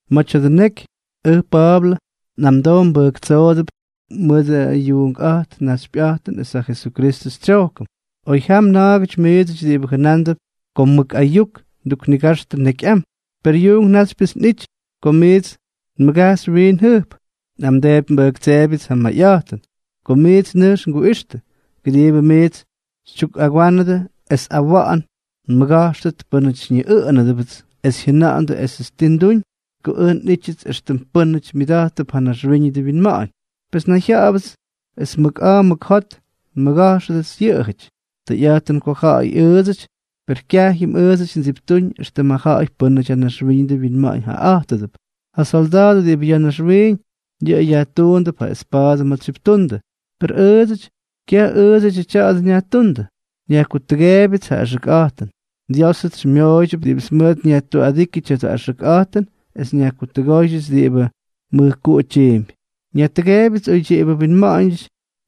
Ma̱ tya̱dʉ neky, ʉj Pa̱a̱blʉ, nꞌamdoo nbʉjktsoodʉp mʉt ja yuunkꞌa̱jt naxypyꞌa̱jtʉn es ja Jesukristʉ tsyojkʉn, oy jam na̱a̱gʉty miidsʉty diꞌibʉ jʉnándʉp ko mʉk ayuk nduknigajxtʉ nekyꞌam, per yuunk náxypyʉts nꞌity ko miits nmʉgajxy wiin jʉjp. Nꞌamdeepy nbʉjtseebyʉts ja mayꞌa̱jtʉn, ko miits nʉjkx nguꞌixtʉ, kʉdiibʉ miits xytyukꞌagwánʉdʉ es awa̱ꞌa̱n nmʉga̱jxʉt pʉ́nʉty xyñiꞌʉꞌʉnʉdʉbʉts es jyʉna̱ꞌa̱ndʉ esʉts ti nduñ mʉt ko ʉj nꞌity éxtʉm pʉ́nʉty myʉda̱jttʉp ja naxwíñʉdʉ winma̱ꞌa̱ñ, pes nnayjya̱ꞌa̱bʉts es mʉk a̱a̱ mʉk jot nmʉga̱jxʉdʉts yʉꞌʉjʉty. Tʉyꞌa̱jtʉn ko ja̱ꞌa̱y ʉʉdsʉty, per kyajyʉm ʉʉdsʉty ndsiptúñ éxtʉm ja ja̱ꞌa̱y pʉ́nʉty ja naxwíñʉdʉ winma̱ꞌa̱ñ jaꞌaꞌa̱jtʉdʉp. Yʉ solda̱a̱dʉ diꞌibʉ ya̱ naxwiiñ, yʉꞌʉ yajtuundʉp ja espa̱a̱dʉ ma̱ tsyiptundʉ; per ʉʉdsʉty, kyaj ʉʉdsʉdyʉ tya̱a̱dʉ nyajtúndʉ, nyajkutʉgeebyʉts ja axʉkꞌa̱jtʉn. Diósʉts xymyooydyʉp diꞌibʉts mʉʉt nyajtuꞌadíkyʉ tya̱dʉ axʉkꞌa̱jtʉn es nyajkutʉgóydyʉts diꞌibʉ mʉjkuꞌu tyiimpy. Nyajtʉgeebyʉts oydyiꞌibʉ winma̱ꞌa̱ñ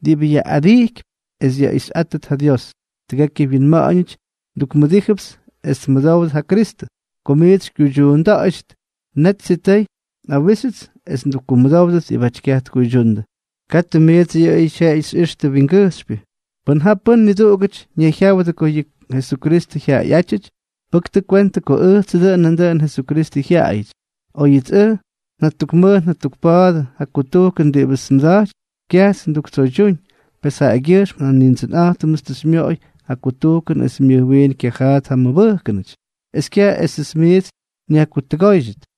diꞌibʉ yaꞌꞌadijkypy es yaꞌixyꞌátʉt ja Dios. Tʉgekyʉ winma̱ꞌa̱ñʉty ndukmʉdíjʉpts es tmʉdówdʉt ja Kristʉ. Ko miits xykyuydyuunda̱ꞌa̱ydyʉt, net sitʉy nꞌawíxyʉts es ndukkumʉdówdʉt diꞌibáty kyaj tkuydyundʉ. Katʉ miidsʉty yʉꞌʉyʉ xyꞌixtʉ wingʉjxypyʉ. Pʉn ja pʉ́n niduꞌugʉty ñayjyáwʉdʉ ko yʉꞌʉ Jesukristʉ jyaꞌayꞌátyʉty, pʉktʉ kwentʉ ko ʉjtsʉ dʉꞌʉn nandʉꞌʉnʉ Jesukristʉ jyaꞌayʉty. Oyʉts ʉj njatukmʉj njatukpa̱a̱dʉ ja kutujkʉn diꞌibʉts nmʉda̱jtypy, kyajts nduktsoydyúñ; pes jaꞌagyʉjxm ja Nindsʉnꞌa̱jtʉmts tʉ xymyoꞌoy yʉ kutujkʉn es myʉj wiin kyajaat ja mmʉbʉjkʉnʉty es kyaj esʉts miits nyajkutʉgóydyʉt.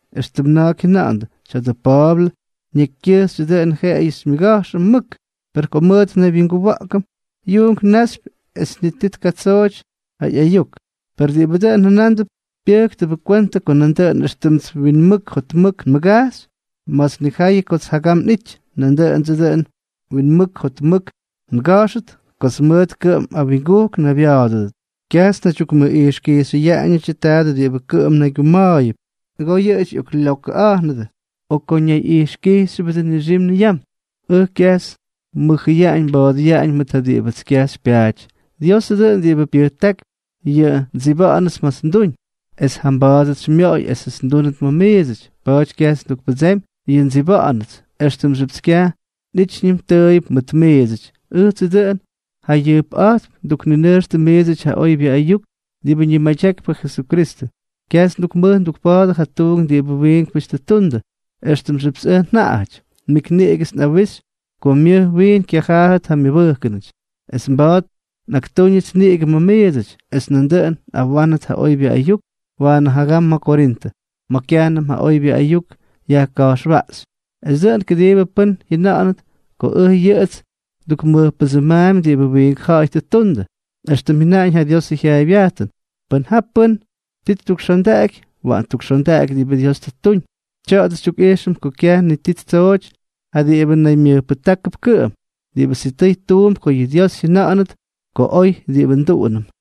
éxtʉm na̱a̱k jyʉna̱ꞌa̱ndʉ: “Tya̱dʉ Pa̱a̱blʉ nekykyʉjxyʉ dʉꞌʉn jeꞌeyʉ xymyʉga̱jxʉm mʉk, per ko mʉt nnaywyinguwa̱ꞌkʉm, yuunk náxypyʉp es ni ti tkatsooty ja ꞌyayuk.” Per diꞌibʉ dʉn jʉnándʉp pyʉ́ktʉbʉ kwentʉ ko nandʉꞌʉn éxtʉmts winmʉk jotmʉk nmʉgajxy ma̱ts nnijayʉ kots jagam nꞌity, nandʉꞌʉndsʉ dʉꞌʉn winmʉk jotmʉk nga̱jxʉt kots mʉʉt kʉꞌʉm awingujk nnaybya̱a̱dʉdʉt. Kyajts nnaydyukmʉꞌijxkijxyʉyaꞌañʉdyʉ tadʉ diꞌibʉ kʉꞌʉm naygyuma̱a̱yʉp. Nʉgoo yʉꞌʉjʉty lyokʉꞌattʉ ko kʉꞌʉm ñayyajkijxyʉbʉdʉ o ko ñayꞌijxkijxyʉbʉdʉ nixim niyam. Ʉj, kyajts nmʉjʉyaꞌañ nba̱a̱dʉyaꞌañ mʉt ja diꞌibʉts kyaj xypyaaty. Diosʉ dʉꞌʉn diꞌibʉ pyʉjtákypy yʉ ndsiba̱ꞌa̱nʉts ma̱ts nduñ, es jamba̱a̱dʉts xymyooy esʉts ndúnʉt ma̱ miidsʉty. Pa̱a̱ty kyajts ndukpʉdsemy yʉ ndsiba̱ꞌa̱nʉts, éxtʉmxyʉpts kyaj nꞌítyñʉm tʉʉyʉp mʉt miidsʉty. Ʉjtsʉ dʉꞌʉn jayʉjpꞌa̱jtp ndukninʉjxtʉ miidsʉty ja oybyʉ ayuk diꞌibʉ ñimadyakypy ja Jesukristʉ. Kyajts ndukmʉj ndukpa̱a̱dʉ ja tuunk diꞌibʉ wiinkpʉty tʉ ttundʉ, éxtʉmxyʉpts ʉj njaꞌajʉty. Nik niꞌigʉts nꞌawixy ko myʉj wiin kyajaat ja mmʉbʉjkʉnʉty, es mba̱a̱t nꞌaktúñʉts niꞌigʉ ma̱ miidsʉty, es nandʉꞌʉn nꞌawánʉt ja oybyʉ ayuk waanʉ jagam ma̱ Korintʉ, ma̱ kyajnʉm ja oybyʉ ayuk yajka̱jxwaꞌxy, es dʉꞌʉn kʉdiibʉ pʉ́n jyʉna̱ꞌa̱nʉt ko ʉj yʉꞌʉts ndukmʉjpʉdsʉmaampy diꞌibʉ wiink ja̱ꞌa̱y tʉ ttundʉ. Extʉm jyʉnaꞌañ ja Diosʉ jyaaybyajtʉn: “Pʉn ja pʉ́n ti ttukxondaꞌaky, waꞌan ttukxondaꞌaky diꞌibʉ Dios tʉ ttuñ.” Tya̱a̱dʉ xytyukꞌijxʉm ko kyaj ti ttsooty ja diꞌibʉ naymyʉjpʉjtákʉp kʉꞌʉm; diꞌibʉ sitʉy tuump ko yʉ Dios jyʉna̱ꞌa̱nʉt ko oy diꞌibʉ nduꞌunʉm.